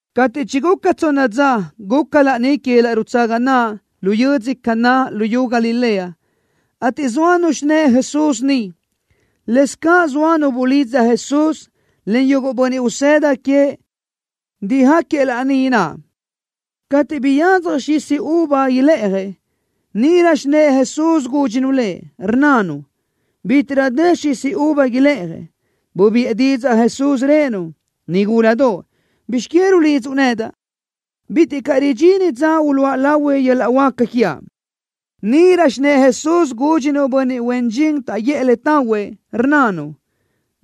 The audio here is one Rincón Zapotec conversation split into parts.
Cateʼ chiguca tsonna dza, guca laní que yöl-laʼ rutsaga naʼ lu yödzö Caná luyú Galilea, ateʼ zóanu xinë́ʼë Jesús niʼ. Lëscaʼ zoa nu bulidza Jesús, en yuguʼ bönniʼ usëda queëʼ dijáquiëʼ laní naʼ. Cateʼ biyadzaj xisi uva ilë́ʼajëʼ, níʼirö xinë́ʼë Jesús gúdxinu Lëʼ, rnnanu: —Bitiʼrö dë xisi uva ilë́ʼajëʼ. Bubiʼë didzaʼ Jesús, rëʼë-nu: —Nigúladoʼ. ¿Bizx que rulidzuʼ nedaʼ? Bitiʼ caʼ ridxini dza uluʼa lahui yöl-laʼ huáca quiaʼ. Níʼirö xinë́ʼë Jesús gúdxinu bönniʼ huen dxin taʼguʼë le tahuëʼ, rnnanu: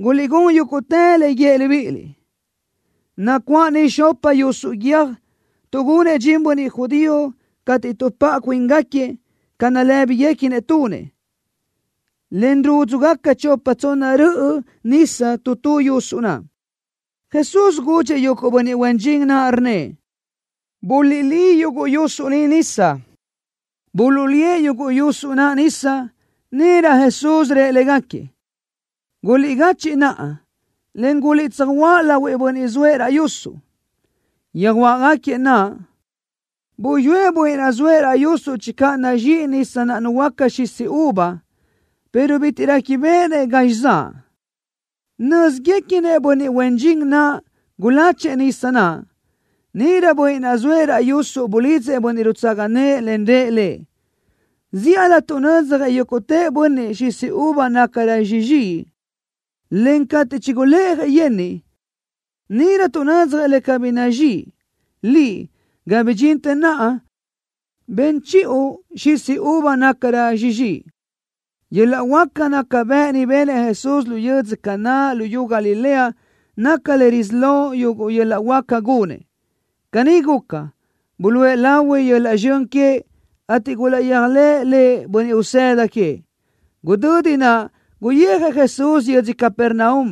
—Guliʼgún yúguʼtë le guíëʼ libíʼiliʼ. Nacuáʼ niʼ xopa yusuʼ guiö́j tuʼgunëʼ dxin bönniʼ judío cateʼ tuʼpáʼa cuíngaquiëʼ ca nalë́biguequinëʼ tunëʼ, en rúdzugaca chopa tsonna röʼö nisa tu tu yusuʼ naʼ. Jesús gudxëʼ yuguʼ bönniʼ huen dxin naʼ, rnnëʼ: —Buliʼlí yuguʼ yusuʼ ni nisa. Buluʼlíëʼ yuguʼ yusuʼ naʼ nisa. Níʼirö Jesús rëʼ légaquiëʼ: —Guliʼgachiʼ naʼa, en guliʼtsöjuáʼ lahuëʼ bönniʼ zoëʼ raʼ yusuʼ. Yöjuáʼgaquiëʼ naʼ. Buyúëʼ bönniʼ naʼ zoëʼ raʼ yusuʼ channö nazxíʼi nisa naʼ nuhuöáca xisi uva, pero bitiʼ réquibeʼenëʼ gazxi zaʼ. Nö́ziguequinëʼ bönniʼ huen dxin naʼ guláchëʼë nisa naʼ. Níʼirö bönniʼ naʼ zoëʼ raʼ yusuʼ bulidzëʼ bönniʼ rutsaga nëʼë, en rëʼ lëʼ: —Zíʼalö tuʼnödzjëʼ yúguʼtë bönniʼ xisi uva nácarö sizxíʼi, en cateʼ chigulë́ʼajëʼ yenniʼ, níʼirö tuʼnödzjëʼ le cabí nazxíʼi. Liʼ, ga bidxintë naʼa ben chiʼu xisi uva nácarö sizxíʼi. Yöl-laʼ huáca naca bëʼ ni benëʼ Jesús lu yödzö Caná luyú Galilea naca le risí lo yuguʼ yöl-laʼ huáca gunëʼ. Caní guca, buluʼe lahui yöl-laʼ zxön queëʼ, ateʼ gulaʼyéajlëʼë Lëʼ bönniʼ usëda queëʼ. Gudödi naʼ guyijëʼ Jesús yödzö Capernaum,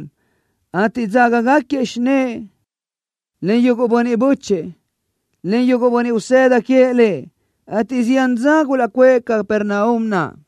ateʼ dzágagaquiëʼ xinë́ʼë, en yuguʼ bönniʼ bö́chëʼë, en yuguʼ bönniʼ usëda queëʼ Lëʼ, ateʼ zián dza gulaʼcuʼë Capernaum naʼ.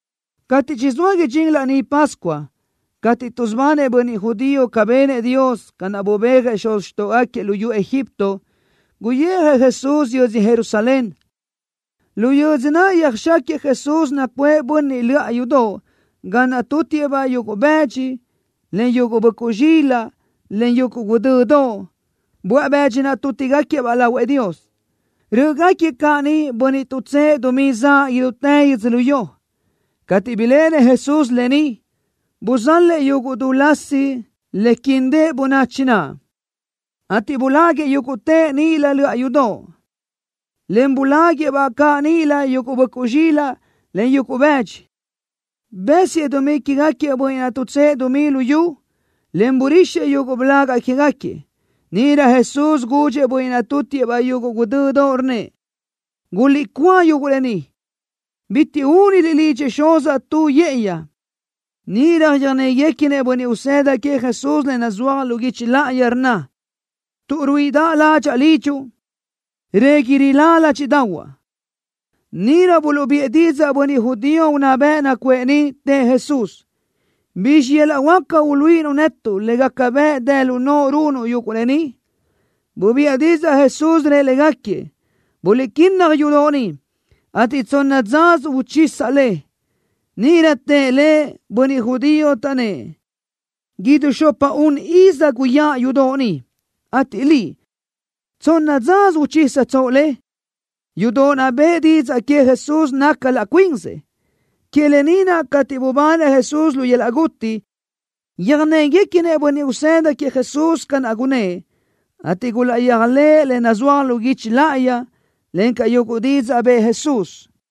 Cateʼ chizóa idxín Laní Pascua cateʼ tuʼsubanëʼ bönniʼ judío ca benëʼ Dios, ca naʼ bubéajëʼ xuz xtóʼogaquiëʼ luyú Egipto, guyijëʼ Jesús yödzö Jerusalén. Lu yödzö naʼ yöjxáquiëʼ Jesús nacuʼë bönniʼ löʼa yudoʼ ga naʼ tútiʼë-baʼ yuguʼ bëdxi, en yuguʼ böʼcuʼ zxilaʼ, en yuguʼ guʼdödoʼ, böaʼ bëdxi naʼ tútigaquiëʼ-baʼ lahuëʼ Dios. Rö́ʼögaquiëʼ caʼ niʼ bönniʼ tuʼtsë́ʼë dumí zaʼ idútë yödzölió. Cateʼ biléʼenëʼ Jesús lë ni, buzalëʼ yuguʼ du lasi le quindëʼ bönachi naʼ, ateʼ buláguiʼë yúguʼtëʼ níʼilö löʼa yudoʼ, en buláguiʼë-baʼ caʼ níʼilö yuguʼ böʼcuʼ zxilaʼ, en yuguʼ bëdxi. Bësiëʼ dumí quégaquiëʼ bönniʼ naʼ tuʼtsë́ʼë dumí lu yu, en burixëʼ yuguʼ blaga quégaquiëʼ. Níʼirö Jesús gudxëʼ bönniʼ naʼ tútiʼë-baʼ yuguʼ guʼdödoʼ, rnnëʼ: —Guliʼcúa yuguʼ lë ni. Bitiʼ úniliʼ lidxëʼ Xuzaʼ tu yë́ʼëyi. Níʼirö yöjnéguequinëʼ bönniʼ usëda queëʼ Jesús le nazúaj lu guichi láʼayi, rnna: Tuʼ ruíʼidaʼ ládxaʼa lidxuʼ, régui rilá ládxiʼdaʼahuaʼ. Níʼirö buluʼbiʼë didzaʼ bönniʼ judío unná bëʼ nacuʼë niʼ, tëʼ Jesús: —¿Bizxi yöl-laʼ huáca uluíʼinuʼ netuʼ le gaca bëʼ dë lu noʼo runuʼ yuguʼ lë ni? Bubiʼë didzaʼ Jesús, rëʼ légaquiëʼ: —Guliʼquínnaj yudoʼ ni, ateʼ tsonna dzasö uchisaʼ le. Níʼirö tëʼ Lëʼ bönniʼ judío, taʼnnë́ʼ: —Idú xopa-un iz guyáʼ yudoʼ ni, ateʼ Liʼ, ¿tsonna dzasö uchísatsoʼ le? Yudoʼ naʼ bëʼë didzaʼ que Jesús naca laʼ cuin cazëʼ. Que lë ni naʼ, cateʼ bubanëʼ Jesús lu yöl-laʼ guti, yöjnéguequinëʼ bönniʼ usëda queëʼ Jesús ca naʼ gunnë́ʼ, ateʼ gulaʼyéajlëʼë le nazúaj lu guichi láʼayi, encaʼ yuguʼ didzaʼ bëʼë Jesús.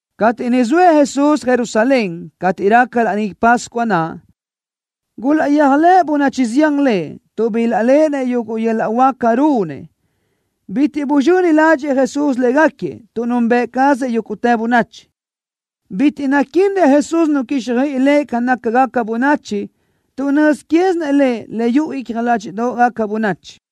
Cateʼ niʼ zoëʼ Jesús Jerusalén, cateʼ raca Laní Pascua naʼ, gulaʼyéajlëʼ bönachi zián Lëʼ, tuʼ bilaʼléʼenëʼ yuguʼ yöl-laʼ huáca runëʼ. Bitiʼ buzxöni ládxëʼë Jesús légaquiëʼ, tuʼ nunbëʼ cazëʼ yúguʼtë bönachi. Bitiʼ naquínnëʼ Jesús nu quíxjöiʼi Lëʼ ca nácagaca bönachi, tuʼ nöz quézinëʼ Lëʼ le yuʼu icja ládxiʼdoʼgaca bönachi.